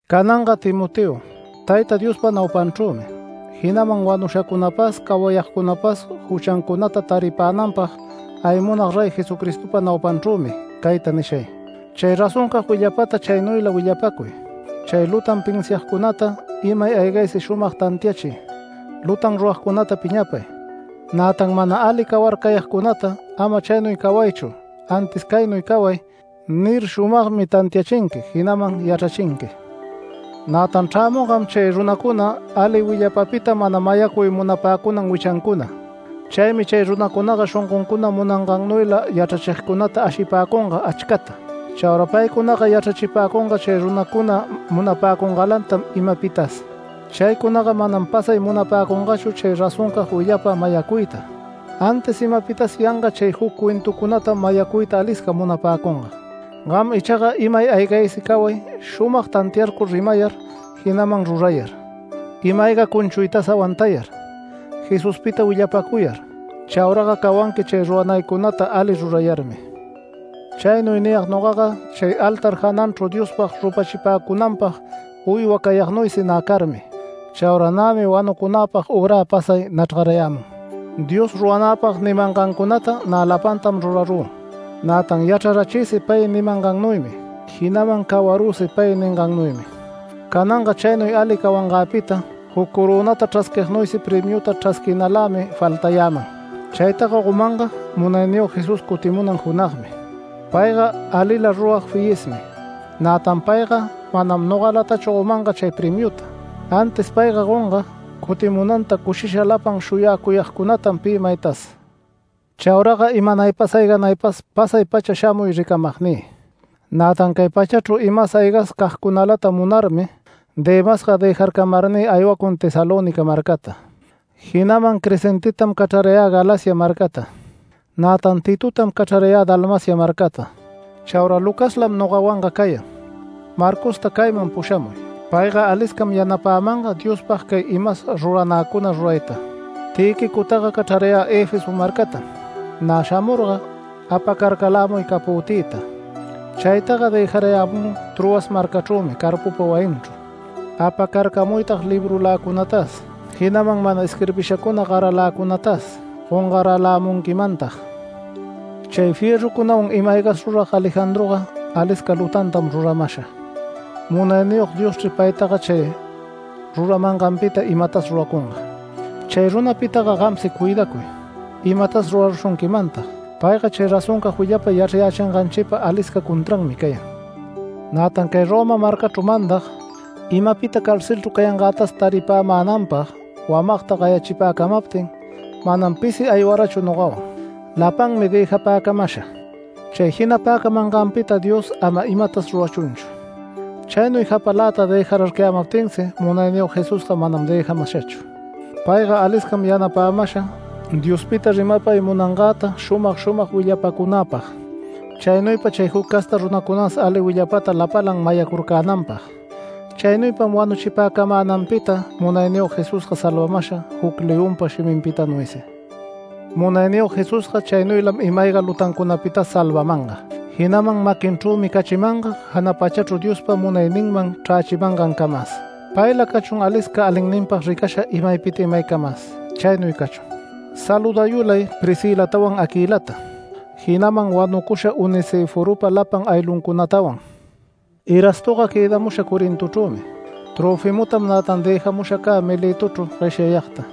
Cananga Timoteo, Tayta Diospa naupanchrümi, jinaman wanushacunapas cawayagcunapas juchancunata taripänanpag aywamug Rey Jesucristopa naupanchrümi cayta nishay: Chay razoncag willapata chaynuyla willapacuy, chay lutan pinsiagcunata imay aygaysi shumag tantiachiy, lutan rurayagcunata piñapay, nätan mana ali cawarcayagcunata “Ama chaynuy cawaychu, antis caynuy caway” nir, shumagmi tantiachinqui, jinaman yachrachinqui. Nätan chrämungam chay runacuna ali willapapita mana mayacuy munapäcunan wichancuna. Chaymi chay runacunaga shongoncuna munangannuyla yachrachigcunata ashipäcunga achcata. Chaura paycunaga yachrachipäcunga chay runacuna munapäcungalantam imapitas. Chaycunaga manam pasay munapäcungachu chay razoncag willapa mayacuyta, antis imapitas yanga chay juc cuentucunatam mayacuyta alisca munapäcunga. Gam ichaga imay aygaysi caway shumag tantiarcur rimayar, jinaman rurayar, ima-ayga cunchuytas awantayar, Jesuspita willapacuyar. Chauraga cawanqui chay ruranaycunata ali rurayarmi. Chaynuy niyag nogaga chay altar jananchru Diospag rupachipäcunanpag uywa cayagnuysi nä carmi. Chaura nämi wanucunäpag ürä pasay nachrgayämun. Dios ruranäpag nimangancunata nä lapantam rurarü. Nätan yachrarachïsi pay nimangannuymi, jinaman cawarüsi pay ningannuymi. Cananga chaynuy ali cawangäpita juc corönata chrasquignuysi premiuta chrasquinalämi faltayäman. Chaytaga gomanga Munayniyog Jesús cutimunan junagmi. Payga alila rurag fiyismi. Nätan payga manam nogalatachu gomanga chay premiuta, antis payga gonga cutimunanta cushisha lapan shuyacuyagcunatam pi maytas. Chauraga imanaypas ayganaypas pasay-pacha shamuy ricamagnï. Nätan cay pachachru imas aygas cagcunalata munarmi Demasga dëjarcamarnï aywacun Tesalónica marcata, jinaman Crescentetam cachrarayä Galacia marcata. Nätan Titotam cachrarayä Dalmacia marcata. Chaura Lucaslam nogawanga cayan. Marcosta cayman pushamuy. Payga aliscam yanapämanga Diospag cay imas ruranäcuna rurayta. Tïquicotaga cachrarayä Efeso marcatam. Nä shamurga apacarcalämuy capötïta. Chaytaga dëjarayämü Troas marcachrümi Carpopa wayinchru. Apacarcamuytag librulacunatas, jinaman mana isquirbishacuna garaläcunatas gongaralämunquimantag. Chay fierrucunawan ima-aygatas rurag Alejandroga alisca lutantam ruramasha. Munayniyog Dioschri paytaga chay ruramanganpita imatas ruracunga. Chay runapitaga gamsi cuidacuy, imatas rurarushunquimantag. Payga chay razoncag willapa yachrayächinganchipa alisca contranmi cayan. Nätan cay Roma marcachru mandag, imapita carcelchru cayangätas taripämänanpag wamagta gayachipäcamaptin manam pisi aywarachu nogawan. Lapanmi dëjapäcamasha. Chay jinapäcunganpita Dios ama imatas rurachunchu. Chaynuy japaläta dëjararcayämaptinsi Munayniyog Jesusga manam dëjamashachu. Payga aliscam yanapämasha Diospita rimapay munangäta shumag shumag willapacunäpag, chaynuypa chay juc casta runacunas ali willapata lapalan mayacurcänanpag. Chaynuypam wanuchipäcamänanpita Munayniyog Jesusga salvamasha juc leonpa shiminpitanuysi. Munayniyog Jesusga chaynuylam ima-ayga lutancunapitas salvamanga, jinaman maquinchrümi cachimanga jana pachachru Diospa munayninman chrächimangancamas. Payla cachun alisca alinninpag ricasha imaypita imaycamas. Chaynuy cachun. Saludayulay Priscilatawan Aquilata, jinaman wanucusha Onesiforopa lapan aylluncunatawan. Erastoga quëdamusha Corintochrümi. Tröfimotam nätan dëjamusha cä Miletochru gueshyayagta.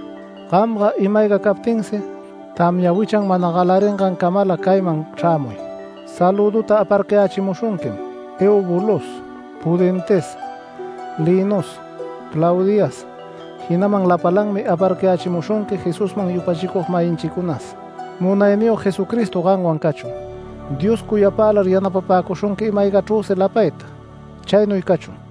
Gamga ima-ayga captinsi tamya wichan mana galaringancamala cayman chrämuy. Salüduta aparcayächimushunquim Eubulos Pudentes Linos Claudias, jinaman lapalanmi aparcayächimushunqui Jesusman yupachicug-mayinchicunas. Munayniyog Jesucristo gamwan cachun. Dios cuyapälar yanapapäcushunqui ima-aygachrüsi lapayta. Chaynuy cachun.